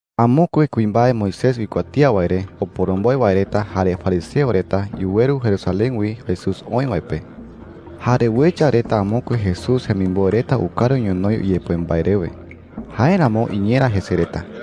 Amokue kuimbae Moisés uikuatía wae re oporomboe wae reta jare fariseo reta yuweru Jerusalén wi Jesús oï wae pe. Jare uecha reta amokue Jesús jemimboe reta ukaru ñonoï uyepoe mbae rewe. Jáeramo iñera jese reta.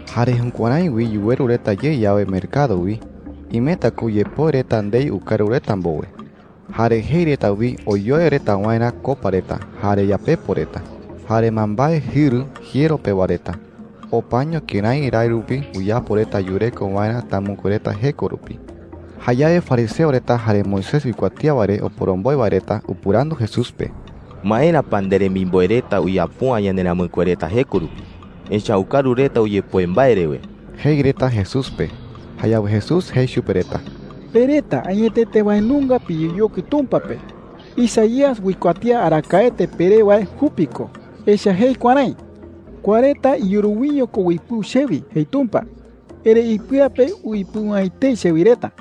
Jare jukuärái wi yuweru reta ye yawe mercado wi, imeta ko uyepoe reta ndei ukaru reta mbowe. Jare jei reta wi oyoe reta waerä copa reta, jare yapepo reta, jare mbaembae jɨru jiero pewa reta. Opaño kërái rái rupi uyapo reta yureko waerä tamɨkue reta jeko rupi. Jayawe fariseo reta jare Moisés uikuatía wae re oporomboe wae reta upɨrandu Jesús pe: “¿Maera pa nderemimboe reta uyapo’ä yanderamɨkue reta jeko rupi? Echa’ä ukaru reta uyepoe mbae rewe,” jei reta Jesús pe. Jayawe Jesús jei chupe reta: “Pe reta añetete wae nunga piyeyokui Tumpa pe. Isaías uikuatía arakaete peré wae jupi ko. Echa’ä jei kuärái: ‘Kua reta iyuru wiño ko uipɨu chewi,’ jei Tumpa. ‘Erëi ipɨa pe uipɨu’ä etei chewi reta.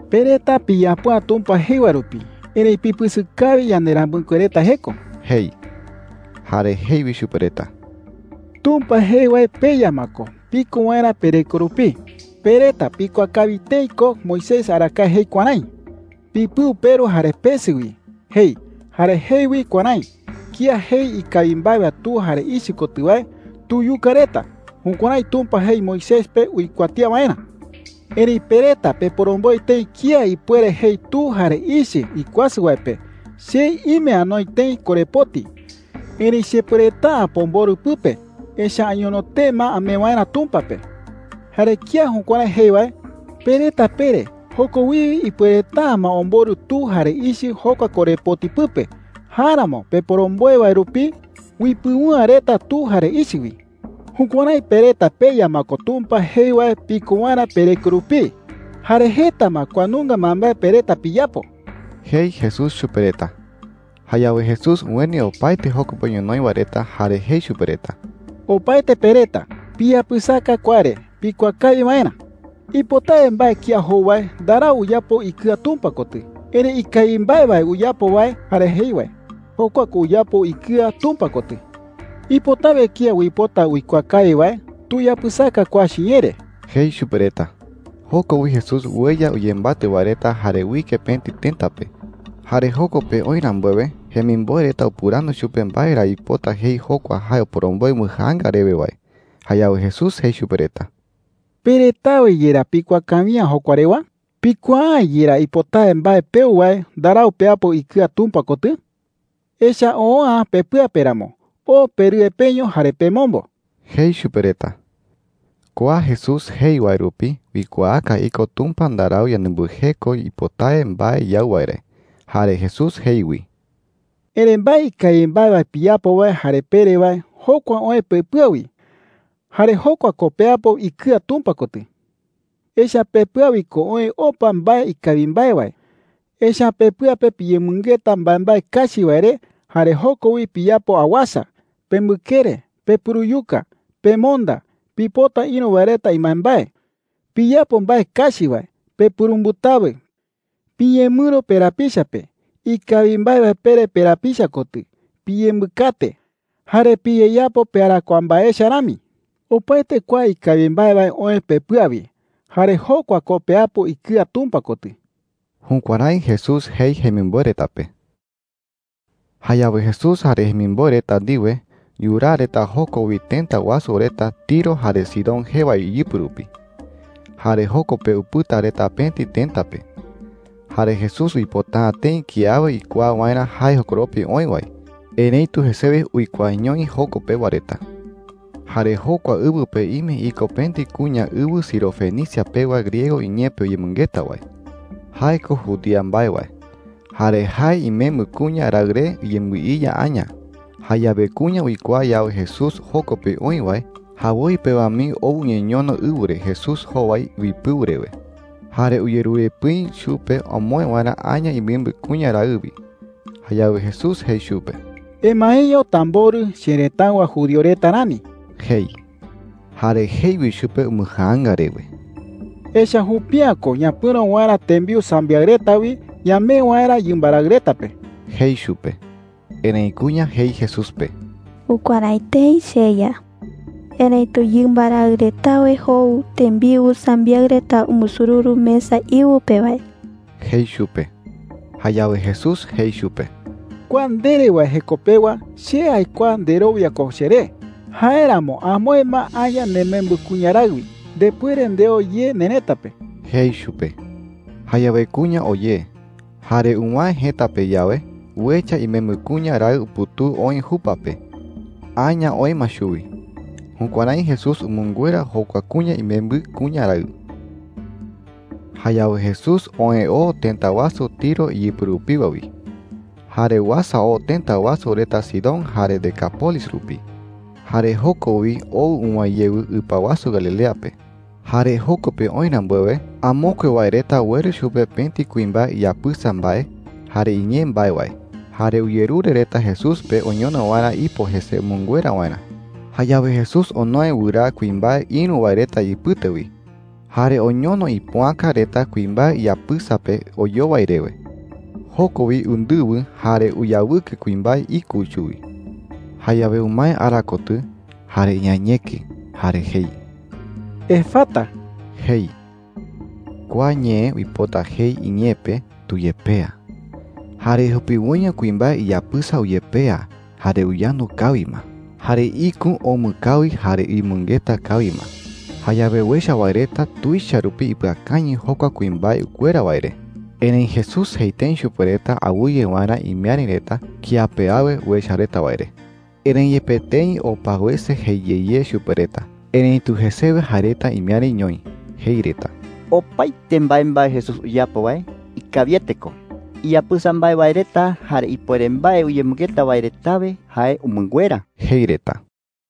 “Pe reta piyapo’ä Tumpa jei wae rupi, erëi pipɨsɨ kawi yanderamɨkue reta jeko,” jei. Jare jei wi chupe reta: “Tumpa jei wae peya ma ko piko waerä pereko rupii. Pe reta pikuaa kawi tëi ko Moisés arakaete jei kuärái: ‘Pipɨu peru jare pesɨ wi,’ jei. Jare jei wi kuärái: ‘Kía jei ikawi mbae wae tu jare ichɨ kotɨ wae, tuyuka reta.’ Jukuärái Tumpa jei Moisés pe uikuatía waerä. Erëi pe reta peporomboe tëi kía ipuere jei tu jare ichɨ ikuasɨ wae pe: ‘Che ime anoi tëi korepoti, erëi chepuereta’ä pomborɨ pɨpe, echa’ä añono tee ma amee waerä Tumpa pe.’ Jare kía jukuärái jei wae, pe reta pere joko wiwe ipuereta’ä ma omborɨ tu jare ichɨ jokua korepoti pɨpe. Jáeramo peporomboe wae rupi uipɨu’ä reta tu jare ichɨ wi. Jukuärái pe reta peya ma ko Tumpa jei wae piko waerä pereko rupii. Jare jeta ma kua nunga mbaembae pe reta piyapo,” jei Jesús chupe reta. Jayawe Jesús ueni opaete joko pe ñonoï wae reta jare jei chupe reta: “Opaete pe reta, piyapɨsaka kua re pikuaa kawi waerä,” jei. “Ipotawe mbae kía jou wae ndarau uyapo ikɨa Tumpa kotɨ. Erëi ikawi mbae wae uyapo wae jare jei wae, jokua ko uyapo ikɨa Tumpa kotɨ,” jei. “Ipotawe kía uipota uikuaa kawi wae, tuyapɨsaka kua chiñee re,” jei chupe reta. Joko wi Jesús ueya uyembatɨ wae reta jare uike pëti tëta pe. Jare joko pe oï rambuewe, jemimboe reta upɨrandu chupe mbae ra uipota jei jokua jae oporomboe umbɨjaanga rewe wae. Jayawe Jesús jei chupe reta: “¿Pe retawe yerá pikuaa kawi’ä jokua rewa?” jei. “¿Pikuaa’ä yerá ipotawe mbae peu wae ndarau peapo ikɨa Tumpa kotɨ? Echa’ä oo’ä pepɨa pe ramo. Oo perɨe peño jare pemombo,” jei chupe reta. (Kua Jesús jei wae rupi uikuaaka iko Tumpa ndarau yanembɨjeko ipotawe mbae yau wae re.) Jare Jesús jei wi: “Erëi mbae ikawi mbae wae piyapo wae jare pere wae, jokua oë pepɨa wi. Jare jokua ko peapo ikɨa Tumpa kotɨ. Echa’ä pepɨa wi ko oë opa mbae ikawi mbae wae, echa’ä pepɨa pe piyemɨngeta mbaembae kachi wae re jare joko wi piyapo awasa, pembɨkere, pepuruyuka, pemonda, pipota ïru wae reta imbaembae, piyapo mbae kachi wae, pepurumbɨtawɨ, piñemɨro perapicha pe, ikawi mbae wae pere perapicha kotɨ, piyembɨkate, jare piyeyapo pearakuaa mbae echa rami,” jei. “Opaete kua ikawi mbae wae oë pepɨa wi. Jare jokua ko peapo ikɨa Tumpa kotɨ.” Jukuärái Jesús jei jemimboe reta pe. Jayawe Jesús jare jemimboe reta ndiwe yuraa reta joko wi tëta wasu reta Tiro jare Sidón jee wae iyɨpɨ rupi. Jare joko pe upɨta reta pëti tëta pe. Jare Jesús uipota’ä tëi kiawe uikuaa waerä jae jokoropi oï wae. Erëitu jesewe uikuaañoi joko pewa reta. Jare jokua ɨwɨ pe ime iko pëti kuña ɨwɨ Sirofenicia pewa griego ñee pe uyemɨngeta wae. Jae ko judía mbae wae. Jare jae imembɨ kuña raɨ re uyembɨiya aña. Jayawe kuña uikuaa yawe Jesús joko pe oï wae, jawoi pewa mii ou uñeñono ɨwɨ re Jesús jowai uipɨu rewe. Jare uyerure pɨi chupe omoë waerä aña imembɨ kuña raɨ wi. Jayawe Jesús jei chupe: “Emaeño tamborɨ cherëtáɨwa judío reta rani,” jei. Jare jei wi chupe umbɨjaanga rewe: “Echa’ä jupi’ä ko ñapɨ̈ro waerä tembiu sambiaɨ reta wi ñamee waerä yɨmba raɨ reta pe,” jei chupe. Erëi kuña jei Jesús pe: “Jukuärái tëi, cheYa,” jei. “Erëitu yɨmba raɨ retawe jou tembiu sambiaɨ reta umbusururu mesa íɨwɨ pe wae,” jei chupe. Jayawe Jesús jei chupe: “Kua ndere wae jeko pewa che aikuaa nderowia ko cheré. Jáeramo amoë ma aña nemembɨ kuña raɨ wi. Ndepuere ndeo ye nerëta pe,” jei chupe. Jayawe kuña oo ye. Jare uwäe jëta pe yawe, uecha imembɨ kuña raɨ uputuu oï jupa pe. Aña oë ma chuwi. Jukuärái Jesús umɨnguera jokua kuña imembɨ kuña raɨ. Jayawe Jesús oë oo tëta wasu Tiro iyɨpɨ rupiwa wi, jare uasa oo tëta wasu reta Sidón jare Decápolis rupi. Jare joko wi oo uwäe yewɨ ɨpa wasu Galilea pe. Jare joko pe oï rambuewe, amokue wae reta ueru chupe pëti kuimbae iyapɨsa mbae jare iñee mbae wae. Jare uyerure reta Jesús pe oñono waerä ipo jese umɨnguera waerä. Jayawe Jesús onoe wɨraa kuimbae ïru wae reta ipɨte wi, jare oñono ipoäka reta kuimbae iyapɨsa pe oyowai rewe. Joko wi undɨwɨ, jare uyawɨkɨ kuimbae ikü chuwi. Jayawe umae ara kotɨ, jare iañeki, jare jei: “¡Efata!” jei. (Kua ñee uipota jei iñee pe, “¡Tuyepea!”) ¡Jare jupiwoiño kuimbae iyapɨsa uyepea jare uyandu kawi ma! ¡Jare ikü omɨ kawi jare uyemɨngeta kawi ma! Jayawe uecha wae reta tuicha rupi ipɨakañɨ jokua kuimbae ukuera wae re. Erëi Jesús jei tëi chupe reta awɨye waerä imiäri reta kía pe awe uecha reta wae re. Erëi yepe tëi opa wese jei ye ye chupe reta, erëitu jesewe jae reta imiäriñoï. Jei reta: “Opaete mbaembae Jesús uyapo wae ikawiete ko. Iyapɨsa mbae wae reta jare ipuere mbae uyemɨngeta wae retawe jae umɨnguera,” jei reta.